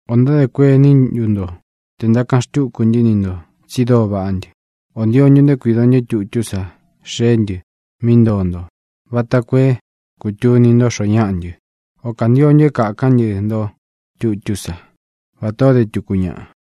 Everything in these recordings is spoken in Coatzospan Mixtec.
¿Ō ntádē kuení ntu nto tē ntákaꞌan xtúku ntɨ́ ni ntō tsi dóo vaꞌá ntɨ? ¿Ō ntio ntu nto é kuīdo ntɨ́ tutú sa xeé ntɨ mí ntoo nto vata koo é kūtuni nto xoó ñaꞌa ntɨ? ¿Ō kantio ntu é kākán ntɨ nto tutú sa, vatā ó de tuku ñaꞌa?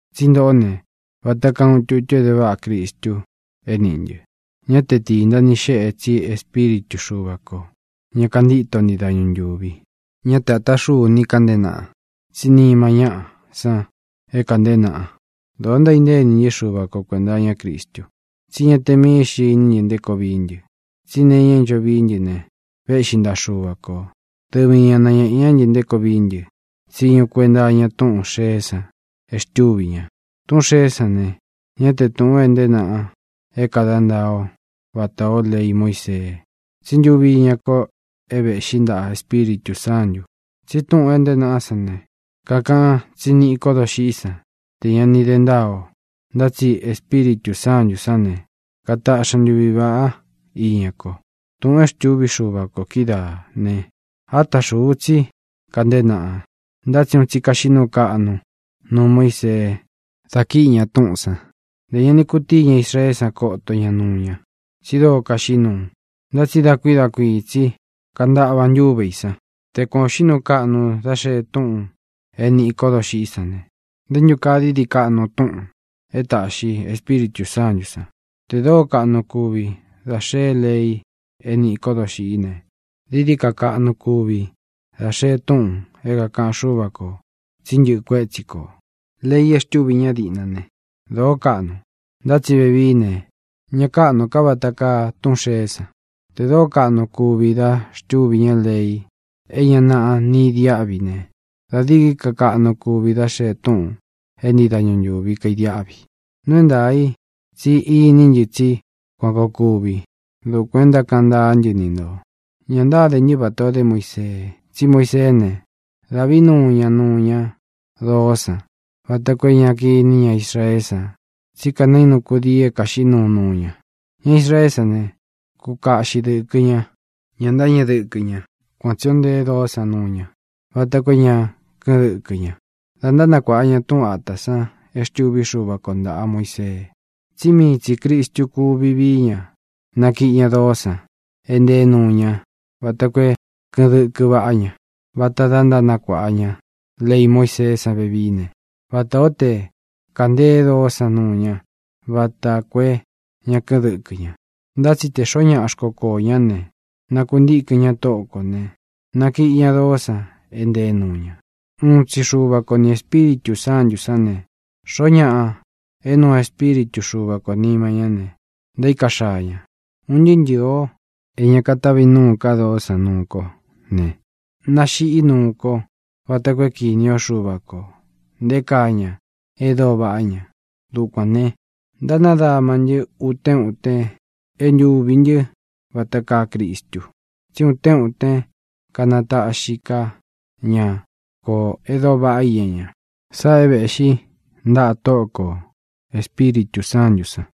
Tsí ntoꞌó ne, vata kaa uun tutu é de váꞌa Cristu é nīꞌí ntɨ. Ñá te tīnta ni xéꞌe, tsí Espíritu Xuva kō, ña kantíto ntii dañu ntūvi. Ñá te āta xúu ni kanteé naꞌa, tsí nima ñáꞌa san é kānteé naꞌa. Dōo ntaíntée ini ntɨ́ Xuva ko kuēnta iñá Cristu. Tsí ña te mií xntɨ iní ntɨ nté koo vií ntɨ, tsí nee iña é ncho vií ntɨ ne, véꞌxi ntaꞌa Xuva kō. Dɨvi ña nañēꞌe ñá ntɨ nté koo vií ntɨ tsiñu kuenta iña túꞌūn xeé san e xtúvī ña. Tūꞌún xeé san ne, ñá te tūꞌun é ntēé naꞌa é kada ntaa o vatā ó lei Muísee, tsí ntuvi iña ko é vēꞌxí ntaꞌa Espíritū Sántū. Tsi túꞌūn é ntēé naꞌá san ne, kakaꞌan tsí niꞌi ko dóxiꞌí san tē ña ni de ntáa o, ntá tsi Espíritū Sántū sán ne, kataꞌxi ña ntuvi vāꞌá iña ko. Tūꞌun e xtúvi Xuva kō kídaā ne, áta xūu tsí kanteé naꞌa. Ntá tsi un tsi kaxiꞌí nuu kaꞌnu nuu Muísee da kíꞌi ña túꞌūn san. Ntē ña ni kutíi ña Israeé san koto ña nuu ña, tsi dóo kaxiꞌí nuu. Ntá tsi da kuīí da kuiī tsi kantaꞌva ntúve ī san. Te kuān o xiꞌí nuu kaꞌnu da xée túꞌūn é nīꞌi kó doxiꞌí san ne, ¿nté ntu kaa dií dií kaꞌnu túꞌūn e táꞌxi Espíritū Sántū san? Tē dóo kaꞌnu kúvi dá xee lei é nīꞌi kó doxiꞌí ne, dií dií ka kaꞌnu kuvi dá xee túꞌūn é kāꞌan Xúva kō tsi ntɨ́ꞌɨ kuétsi kō. Lei e xtúvi ñá diꞌna ne, dōó kaꞌnu, ntá tsi vevií ne, ña káꞌnū ka vata kaa túꞌūn xeé san. Tē dóo kaꞌnu kúvi da xtúvi ña lei é ña naꞌa ni idiáꞌvi ne, da dií dií ka kaꞌnu kuvi dá xee túꞌūn e ntíi dañu ntūvi kaidiáꞌvi. Nuu é ntaā i tsí iní ntɨ tsí kuān koo kuvi. Dukuān é ntákaꞌan ntaá ntɨ ni ntō. Ñā ntáde ntɨ́ vatā o dé Muisee. Tsí Muiseé ne, dávī nuu ña nuu ña dóo san vata koo é ña kiní ña Israeé san tsí kanainu kudii é kāxiꞌí nuu nuu ña. Ña Israeé san ne, kúkaꞌxi dɨ̄kɨ ña; ñá ntáñeꞌe dɨkɨ ña. Kuan tsī ó ntee doó san nuu ña vata koo é ña kɨ́ꞌɨn dɨkɨ ña da ntánakuāꞌa ña túꞌun āta san e xtúvi Xuva ko ntāꞌa Muisee, tsí mii tsī Cristu kuvi vií ña nakiꞌi ña doó san é nteé nuu ña vata koo é kɨꞌɨn dɨkɨ vaꞌá ña. Vata da e ntánakuāꞌa ña lei Muíseé san vevií ne, vatā ó te kanteé doó san nuu ña vata koo é ña kɨ́ꞌɨn dɨkɨ ña. Ntá tsi tē xoó ñaꞌa xkokoō ñá ne, nakuntíkɨn ña Tóꞌo kō ne, nakiꞌi ña doó san é ntee nuu ña. Uun tsi Xúva ko ni Ēspíritū Sántū sán ne, xoo ñáꞌa é nuu Espíritū Xúva kō nima ñá ne, ntaíka xaa ña. Un ntɨɨ́ ntɨɨ̄ o é ña katavi núu ka doó san nuu ko ne, nāxiꞌí nuu ko vata koo é kīni ó Xuva kō nté kaa ña e dóo vaꞌá ña. Dukuān ne, ntánadama ntɨ́ utén uten é ntūvi ntɨ́ vata kaa Cristu, tsí utén utén kanataꞌxi ká ña kō e dóo vaꞌá iña ña. Sáꞌā é vēꞌxí ntaꞌa Tóꞌo kō Espíritū Sántū san.